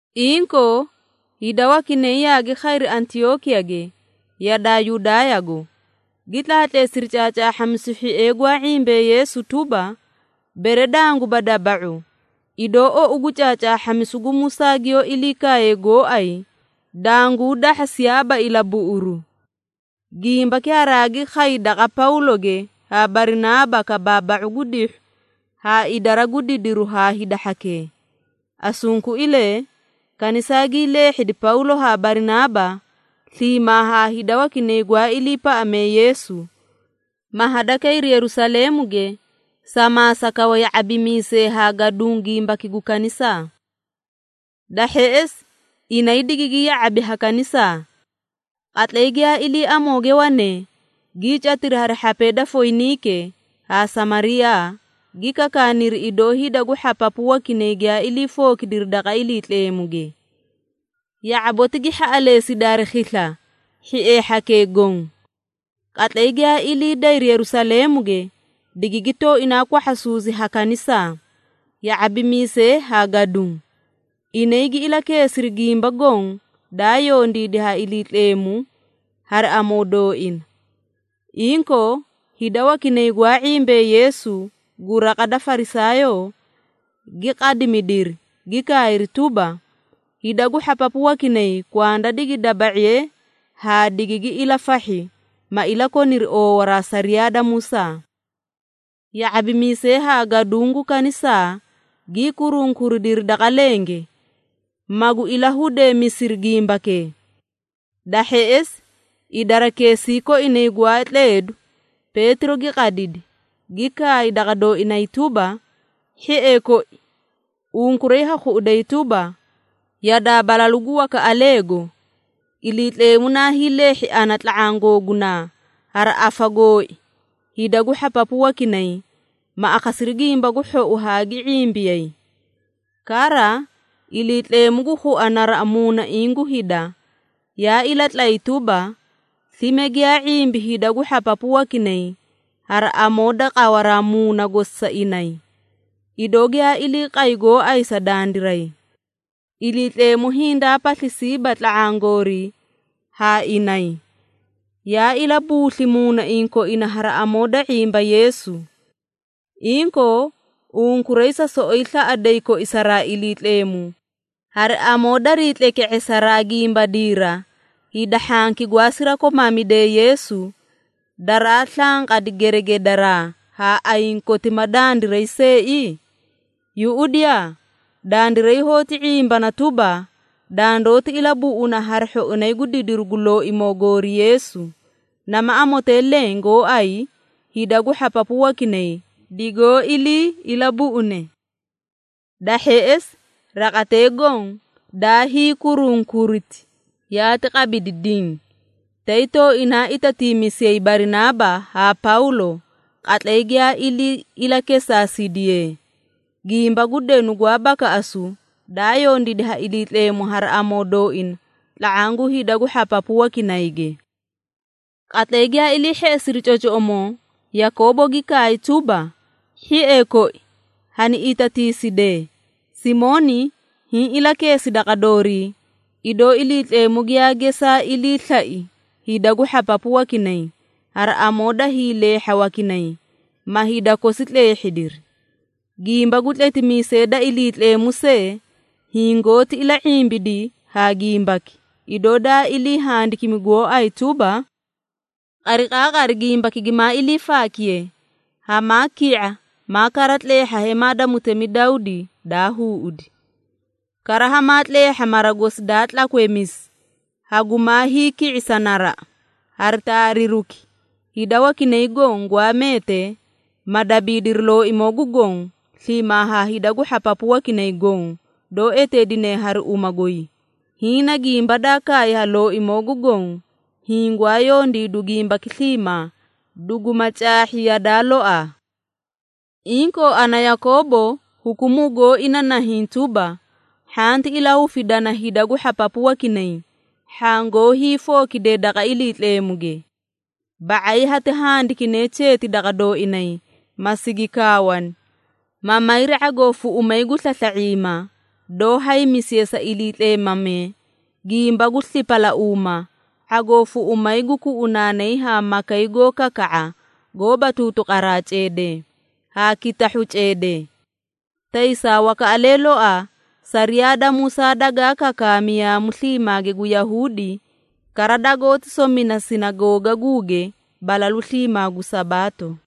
Inkoo, hida wakinay yaagi khayri Antiyookiyage yadaa Yudaayago, gi tlaatleesiri caacaahhamisu hhiee gwaa ⁄imbee Yeesu tuba, “Bere danguba daba⁄u, idoo ou gu caacaahhamisu gu Musaa giyoó ilii kaaye gooay, danguu dahhasiyaaba ilabuꞌuru.” Gimbaki haraagi khay daqa Pawloge haa Barinaaba kabaaba⁄u gu dihhu haa idara gu didiru haa hida hhakee. Asunkuilee, kanisaa gii leehhedi Pawlo haa Barinaaba sliimaa haa hida wakinay gwaa iliipaꞌamee Yeesu, ma hadakayri Yerusaleemuge sa maasa kawa ya⁄abimiisee haa gaduũ gimbaki gu kanisaa. Da hheꞌesi inay digigi ya⁄abi ha kanisaa. Qatlay giyaa ilii amooge wanee, gii catiri hari hhapee da Foyiniike haa Samariyaa, gi kakaaniri, idoo hida gu hhapapu wakinay giyaa ilii fookidiri daqa Iliitleemuge. Ya⁄aboti gi hhaꞌaleesidi hari khisla hhiee hhakee goõ. Qatlay giyaa ilii dayri Yerusaleemuge, digigi tooinaa kwahhasuusi ha kanisaa, ya⁄abimiisee haa gaduũ. Inay gi ilakeesiri gimba goõ daa yondiidi ha Iliitleemu hari amoo dooina. Inkoo, hida wakinay gwaa ⁄imbee Yeesu gu raqa da Farisaayoo, gi qadimidiri, gi kaayri tuba, “Hida gu hhapapu wakinay kwanda digi daba⁄iye haa digigi ilafahhi, ma ilakoniri oowaraa sariyaa da Musaa.” Ya⁄abimiisee haa gaduũ gu kanisaa gii kurunkuridiri daqa lenge, magu ilahudeemisiri gimbakee. Da hheꞌesi idarakeesii koinay gwaa tleedu, Peetiro gi qadidi, gi kaay daqa dooinay tuba, “Hhiee koi, unkuray ha khuꞌuday tuba, yadaa balalu gu wakaꞌaleego, Iliitleemu naa hiileehhi ana tla⁄aã googunaa, hari afa gooi hida gu hhapapu wakinay, ma akhasiri Gimba gu Hhou haa gi ⁄imbiyay. Kara Iliitleemu gu khua naraꞌa muunaiĩ gu hida, yaa ilatlay tuba, slime giyaa ⁄imbi hida gu hhapapu wakinay hari amoo da qawaraa Muuna gosi sa inay, idoo giyaa ilii qay gooay sa dandiray. Iliitleemu hindaa paslisiiba tla⁄aã goorii haa inay, yaa ilabuusli muunaiĩ koina hari amoo da ⁄imba Yeesu. Inkoo, unkuray sa soꞌoyi slaꞌaday koisaraa Iliitleemu, hari amoo darii tleke⁄esaraa gimbadiira hida hhanki gwaa sirakomaamidee Yeesu, daraa slanqadi geregedaraa ha ayiĩ koti ma dandiray seei? Yuꞌudiyaa! Dandiray hoóti ⁄imbana tuba, dandoóti ilabuꞌuna hari hhoinay gu didiru gu Looimoo goori Yeesu, nama amotee leẽ gooay hida gu hhapapu wakinay, digoó ilii ilabuꞌune.” Da hheꞌesi raqatee goõ daa hiikurunkuriti, yaati qabidi diĩ, tay tooinaa itatiimisiyay Barinaaba haa Pawlo qatlay giyaa ilii ilakesaasidiyee, gimba gu denu gwaa bakaꞌasu, daa yondiidi ha Iliitleemu hari amoo dooina tla⁄aã gu hida gu hhapapu wakinayge. Qatlay giyaa ilii hheꞌesiri cocoꞌomoo, Yakoobo gi kaay tuba, “Hhiee koi, hani itatiisidee.” Simooni hiĩ ilakeesi daqa doorii, idoo Iliitleemu giyaa gesaa ilii slai hida gu hhapapu wakinay, hari amoo daa hiileehha wakinay, ma hida kosi tleehhidiri. Gimba gu tletimiisee da Iliitleemu see hingoóti ila⁄imbidi haa gimbaki, idoo daa ilii handikimi gooay tuba, “Qariqaaqari gimbaki gimaa ilii faakiye, hamaa ki⁄a, maa kara tleehha hemaa da mutemi Dawdi, daa huuꞌudi. Kara hamaa tleehha mara gosi daa tlakweemisi, hagumaa hiiki⁄isa naraꞌa, hari taariruki, hida wakinay goõ gwaa meetee, ma dabiidiri Looimoo gu Goõ, sliimaa ha hida gu hhapapu wakinay goõ, doó eteedine hari uma goy, hiĩ na gimba daa kaay ha Looimoo gu Goõ, hiĩ gwaa yondiidu gimbaki sliimaa, duguma caahhi yadaa loaa.” Inkoo ana Yakoobo hukumuu gooi na nahiĩ tuba, “Hhanti ilahufidana hida gu hhapapu wakinay, hhaã goó hiifookidee daqa Iliitleemuge. Ba⁄ay hati handikine cheeti daqa dooinay, ma sigi kaawani, ma mayri ⁄agoo fuꞌumay gu slasla⁄iima doó haymisiye sa iliitleemamee, gimba gu slipalauuma, ⁄agoo fuꞌumay gu kuꞌunaanay haa makay goó kaka⁄a goóba tuutuqaraa ceedee, haa kitahhu ceedee. Taysaa wakaꞌalee loaa sariyaa da Musaa dagaa kakaami yaamu sliimaage gu Yahuudi, kara dagoóti somina sinagoogaguuge balalu sliimaa gu Sabaato.”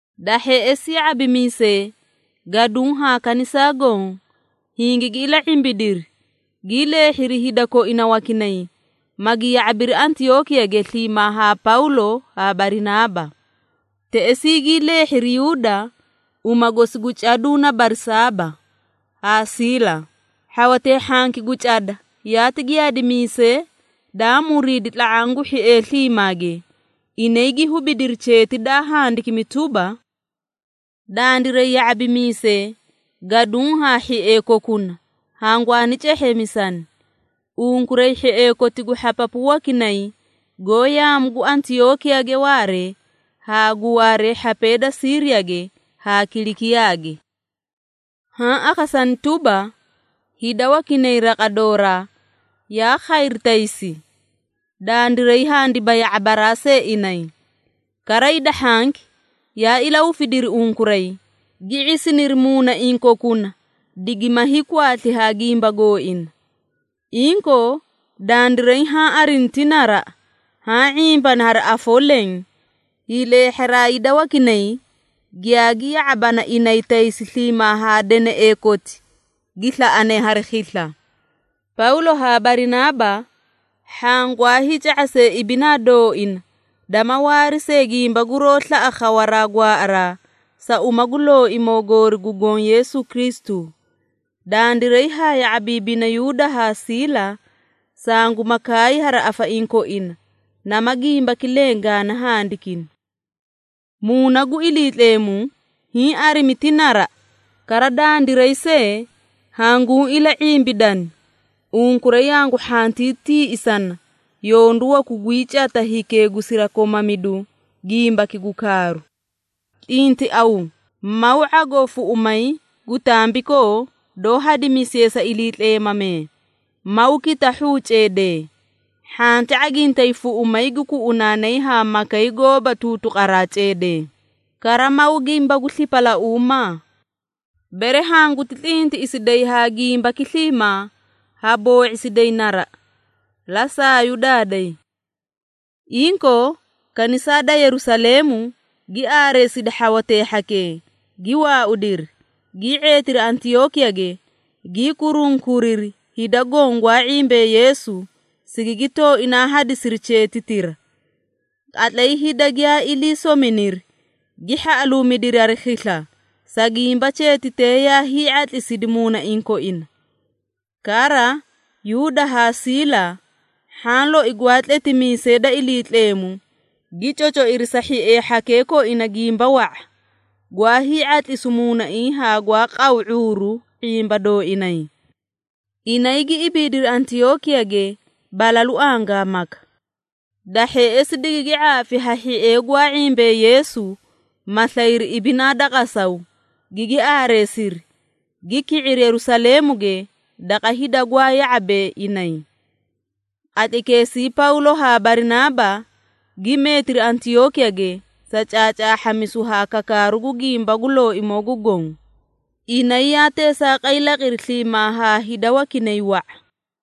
Da hheꞌesi ya⁄abimiisee, gaduũ haa kanisaa goõ, hingigi ila⁄imbidiri, gii leehhiri hida koina wakinay, magi ya⁄abiri Antiyookiyage sliimaa haa Pawlo haa Barinaaba. Teꞌesii gii leehhiri Yuuda, uma gosi gu caduu na Barsaaba, haa Siila. Hhawatee hhanki gu cada yaati giyaadimiisee daa muriidi tla⁄aã gu hhiee sliimaage, inay gi hubidiri cheeti daa handikimi tuba, “Dandiray ya⁄abimiisee, gaduũ haa hhiee kokuna, hangwaani cehheemisani unkuray hhiee koti gu hhapapu wakinay goó yaamu gu Antiyookiyage waaree, haa gu waaree hhapee da Siiriyage haa Kilikiyaage.” Haã akhasani tuba, hida wakinay raqa dooraa yaa khayri taysi, dandiray handiba ya⁄abaraa see inay. Kara hida hhanki yaa ilahufidiri unkuray, gi ⁄isiniri muunaiĩ kokuna digima hiikwaasli ha gimba gooina. Inkoo, dandiray haã arini ti naraꞌa, haã ⁄imbani hari afoo leẽ, hiileehharaa hida wakinay, giyaagi ya⁄abana inay taysi sliimaa haa deneꞌee koti gi slaꞌane hari khisla. Pawlo haa Barinaaba, hhaã gwaa hiica⁄asee ibinaa dooina dama waari see gimba guroó slaꞌa khawaraa gwaaꞌaraa sa uma gu Looimoo goori gu Goõ Yeesu Kristu. Dandiray haa ya⁄abiibina Yuuda haa Siila, sanguma kaay hari afaiĩ koina, nama gimbaki leẽ gaani handikini. Muuna gu Iliitleemu hiĩ arimi ti naraꞌa, kara dandiray see hanguũ ila⁄imbidani, unkuray hangu hhantii tiiꞌisana yondu waku guyii cata hikee gu sirakomamidu gimbaki gu kaaru. Tlintiaw, maw ⁄agoo fuꞌumay gu tambikoo doó hadimisiye sa iliitleemamee, maw kitahhuu ceedee, hhanti ⁄agintay fuꞌumay gu kuꞌunaanay haa makay goóba tuutuqaraa ceedee, kara maw gimba gu slipalauumaa. Bere hanguti tlintiꞌisiday haa gimbaki sliimaa ha boo⁄isiday naraꞌa. La saayu daaday. Inkoo, kanisaa da Yerusaleemu gi aareesidi hhawatee hhakee, gi waaudiri, gii ⁄eetiri Antiyookiyage, gii kurunkuriri hida goõ gwaa ⁄imbee Yeesu, sigigi tooinaa hadisiri cheetitira. Qatlay hida giyaa ilii sominiri, gi hhaꞌaluumidiri hari khisla, sa gimba cheetitee yaa hii⁄atlisidi muunaiĩ koina. Kara, Yuuda haa Siila, hhaã loi gwaa tletimiisee da Iliitleemu gi cocoiri sa hhiee hhakee koina gimba wa⁄a, gwaa hii⁄atlisu muunaiĩ haa gwaa qaw ⁄uuru ⁄imba dooinay. Inay gi ibiidiri Antiyookiyage balalu angaamaka. Da hheꞌesi digigi ⁄aafi ha hhiee gwaa ⁄imbee Yeesu, ma slayri ibinaa da qasaw, gigi aareesiri, gi ki⁄iri Yerusaleemuge daqa hida gwaa ya⁄abee inay. Qatlaykeesii Pawlo haa Barinaaba gi meetiri Antiyookiyage sa caacaahhamisu haa kakaaru gu gimba gu Looimoo gu Goõ. Inay yaa teesaaqay laqiri sliimaa haa hida wakinay wa⁄a.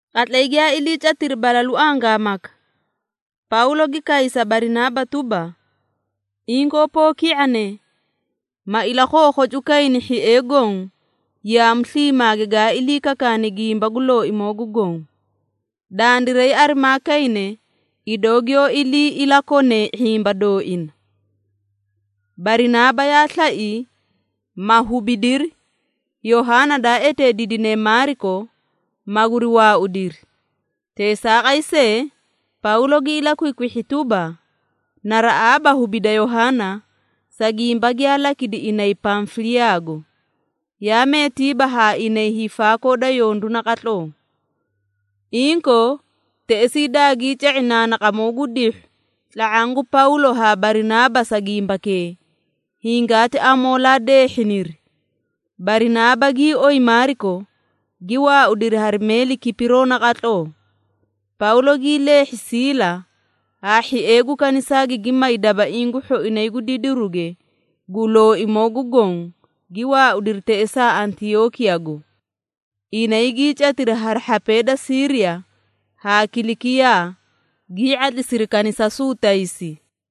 Qatlay giyaa iliicatiri balalu angaamaka, Pawlo gi kaay sa Barinaaba tuba, “Inkoo poo ki⁄ane, ma ilakhookhocuukayni hhiee goõ yaamu sliimaage gaa ilii kakaani gimba gu Looimoo gu Goõ. Dandiray arimaa kayne, idoo giyoó ilii ilakonee ⁄imba dooina.” Barinaaba yaa slai, ma hubidiri Yohaana daa eteediidine Maariko, maguri waaudiri. Teesaaqay see, Pawlo gi ilakwikwihhi tuba, naraꞌaaba hubida Yohaana, sa gimba giyaa lakidi inay Pamfiliyaago, yaa meetiiba haa inay hiifaakoo da yondu naqatloo. Inkoo, teꞌesii dagii ca⁄i naanaqamoo gu dihhu tla⁄aã gu Pawlo haa Barinaaba sa gimbakee, hingaati amoolee deehhiniri. Barinaaba gii oyi Maariko, gi waaudiri hari meeli Kipiroo naqatloo. Pawlo gii leehhi Siila, haa hhiee gu kanisaa gigi may dabaiĩ gu hhoinay gu didiruge gu Looimoo gu Goõ, gi waaudiri teꞌesaa Antiyookiyago. Inay gii catiri hari hhapee da Siiriya haa Kilikiyaa, gii ⁄atlisiri kanisasuu taysi.